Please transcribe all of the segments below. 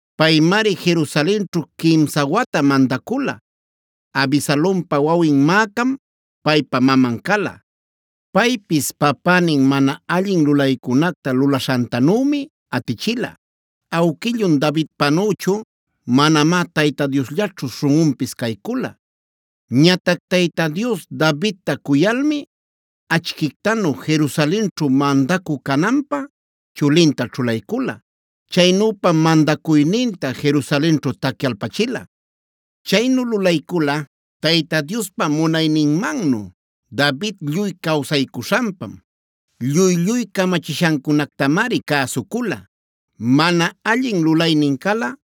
Paymari Jerusalenćhu quimsa wata mandacula. Abisalompa wawin Maacam paypa maman cala. Paypis papänin mana allin lulaycunacta lulaśhantanümi atichila. Awquillun Davidpanüchu manamá Tayta Diosllaćhu śhunꞌunpis caycula. Ñatac Tayta Dios Davidta cuyalmi achquictanu Jerusalenćhu mandacü cananpä chulinta ćhulaycula.a Chaynüpam mandacuyninta Jerusalenćhu tacyalpachila. Chaynu lulaycula Tayta Diospa munayninmannu David lluy cawsaycuśhanpam. Lluy-lluy camachishancunactamari cäsucula. Mana allin lulaynin cala,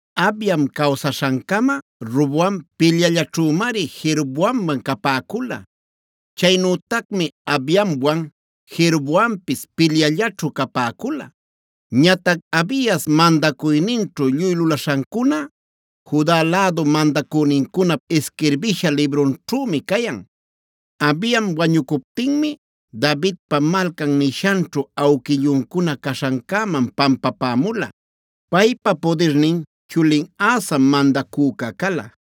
Abiam cawsaśhancama Roboamc pilyallaćhümari Jeroboamwan capäcula. Chaynütacmi Abiamwan Jeroboampis pilyallaćhu capäcula. Ñatac Abias mandacuyninćhu lluy lulaśhancuna Juda lädu mandacünincunap isquirbisha librunćhümi cayan. Abiam wañucuptinmi Davidpa Malcan nishanćhu awquilluncuna caśhancäman pampapämula. Paypa pudirnin chulin Asam mandacüca cala.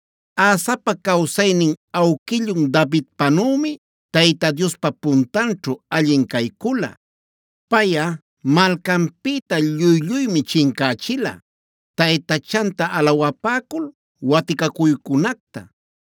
Asapa cawsaynin awquillun Davidpanümi Tayta Diospa puntanćhu allin caycula. Payꞌa malcanpïta lluy-lluymi chincächila taytachanta alawapäcul waticacuycunacta.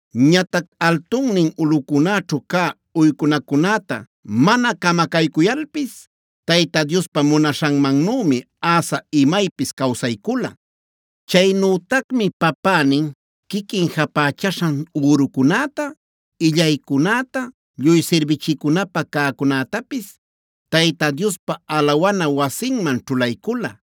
Ñatac altunnin ulꞌucunäćhu cä uycunacunäta mana camacaycuyalpis Tayta Diospa munaśhanmannümi Asa imaypis cawsaycula. Chaynütacmi papänin, quiquin japächaśhan ürucunäta, illaycunäta, lluy sirbichicunapä cäcunätapis Tayta Diospa alawana wasinman ćhulaycula.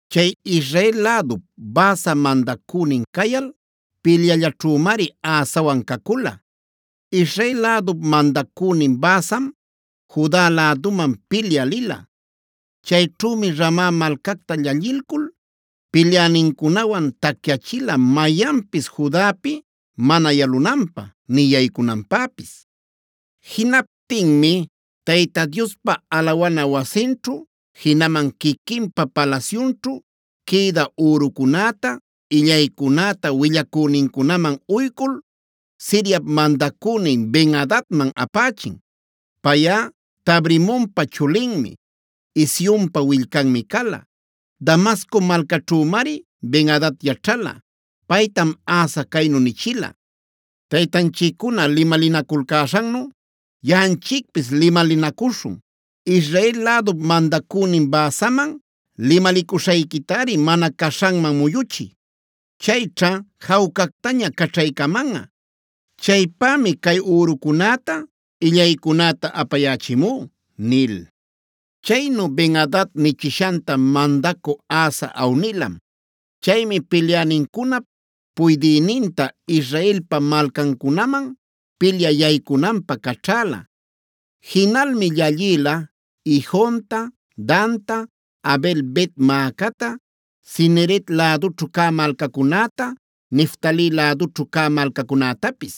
Chay Israel lädup Baasa mandacünin cayal pilyallaćhümari Asawan cacula. Israel lädup mandacünin Baasam Juda läduman pilyä lila. Chayćhümi Rama malcacta llallilcul pilyänincunawan tacyachila mayanpis Judapi mana yalamunanpä ni yaycunanpäpis. Jinaptinmi Tayta Diospa alawana wasinćhu, jinaman quiquinpa palasyunćhu quïdä ürucunäta, illaycunäta willacünincunaman uycul Siriap mandacünin Ben-adadman apächin. Payꞌa Tabrimonpa chulinmi, Hezionpa willcanmi cala. Damasco malcaćhümari Ben-adad yaćhala. Paytam Asa caynu nichila: “Taytanchiccuna limalinaculcäśhannu yaꞌanchicpis limalinacuśhun. Israel lädup mandacünin Baasaman limalicuśhayquitari mana caśhanman muyuchiy. Chayćha jawcactaña caćhaycamanꞌa. Chaypämi cay ürucunäta, illaycunäta apayächimú” nil. Chaynu Ben-adad nichishanta mandacü Asa awnilam. Chaymi pilyänincunap puydïninta Israelpa malcancunaman pilyä yaycunanpä caćhäla. Jinalmi llallïla Ijonta, Danta, Abel-bet-maacata, Cineret lädućhu cä malcacunäta, Neftali lädućhu cä malcacunätapis.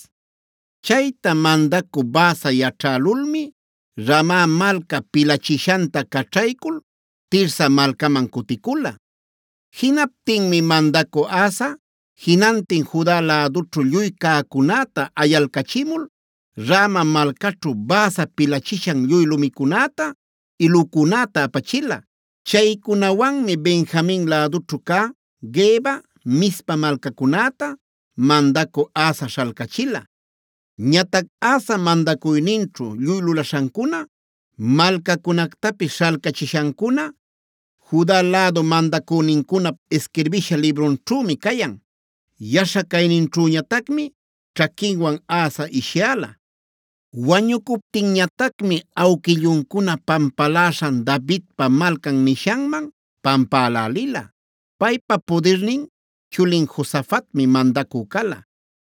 Chayta mandacü Baasa yaćhälulmi Rama malca pilachishanta caćhaycul Tirsa malcaman cuticula. Jinaptinmi mandacü Asa jinantin Juda lädućhu lluy cäcunäta ayalcachimul Rama malcaćhu Baasa pilachishan lluy lumicunäta, ilucunäta apachila. Chaycunawanmi Benjamin lädućhu cä Geba, Mizpa malcacunäta mandacü Asa śhalcachila. Ñatac Asa mandacuyninćhu lluy lulaśhancuna, malcacunactapis śhalcachishancuna Juda lädu mandacünincunap isquirbisha librunćhümi cayan. Yaśha cayninćhüñatacmi ćhaquinwan Asa ishyäla. Wañucuptinñatacmi awquilluncuna pampaläśhan Davidpa Malcan nishanman pampälälila. Paypa pudirnin chulin Josafatmi mandacü cala.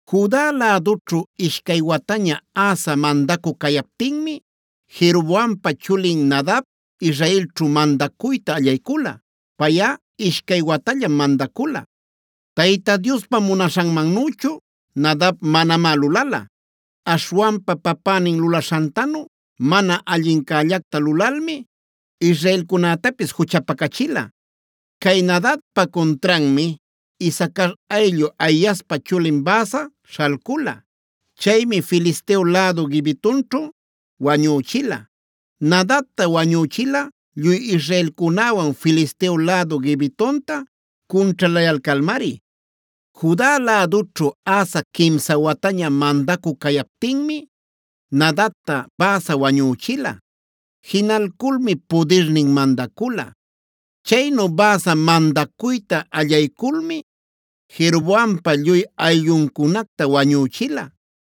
Juda lädućhu ishcay wataña Asa mandacü cayaptinmi Jeroboampa chulin Nadab Israelćhu mandacuyta allaycula. Payꞌa ishcay watallam mandacula. Tayta Diospa munaśhanmannüchu Nadab manamá lulala. Aśhwanpa papänin lulaśhantanu mana allincällacta lulalmi israelcunätapis juchapacachila. Cay Nadabpa cuntranmi Isacar ayllu Ahiaspa chulin Baasa śhalcula. Chaymi Filisteo lädu Gibetonćhu wañüchila. Nadabta wañüchila lluy israelcunäwan Filisteo lädu Gibetonta cunćhalayalcalmari. Juda lädućhu Asa quimsa wataña mandacü cayaptinmi Nadabta Baasa wañüchila. Jinalculmi pudirnin mandacula. Chaynu Baasa mandacuyta allayculmi Jeroboampa lluy aylluncunacta wañüchila.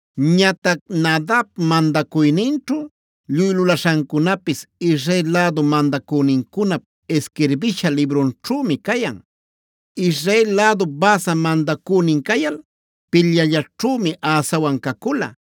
Ñatac Nadab mandacuyninćhu lluy lulaśhancunapis Israel lädu mandacünincunap isquirbisha librunćhümi cayan. Israel lädup Baasa mandacünin cayal pilyallaćhümi Asawan cacula.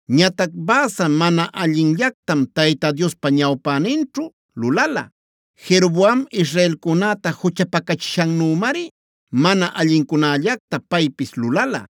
Ñatac Baasa mana allinllactam Tayta Diospa ñawpäninćhu lulala. Jeroboam israelcunäta juchapacachishannümari mana allincunällacta paypis lulala.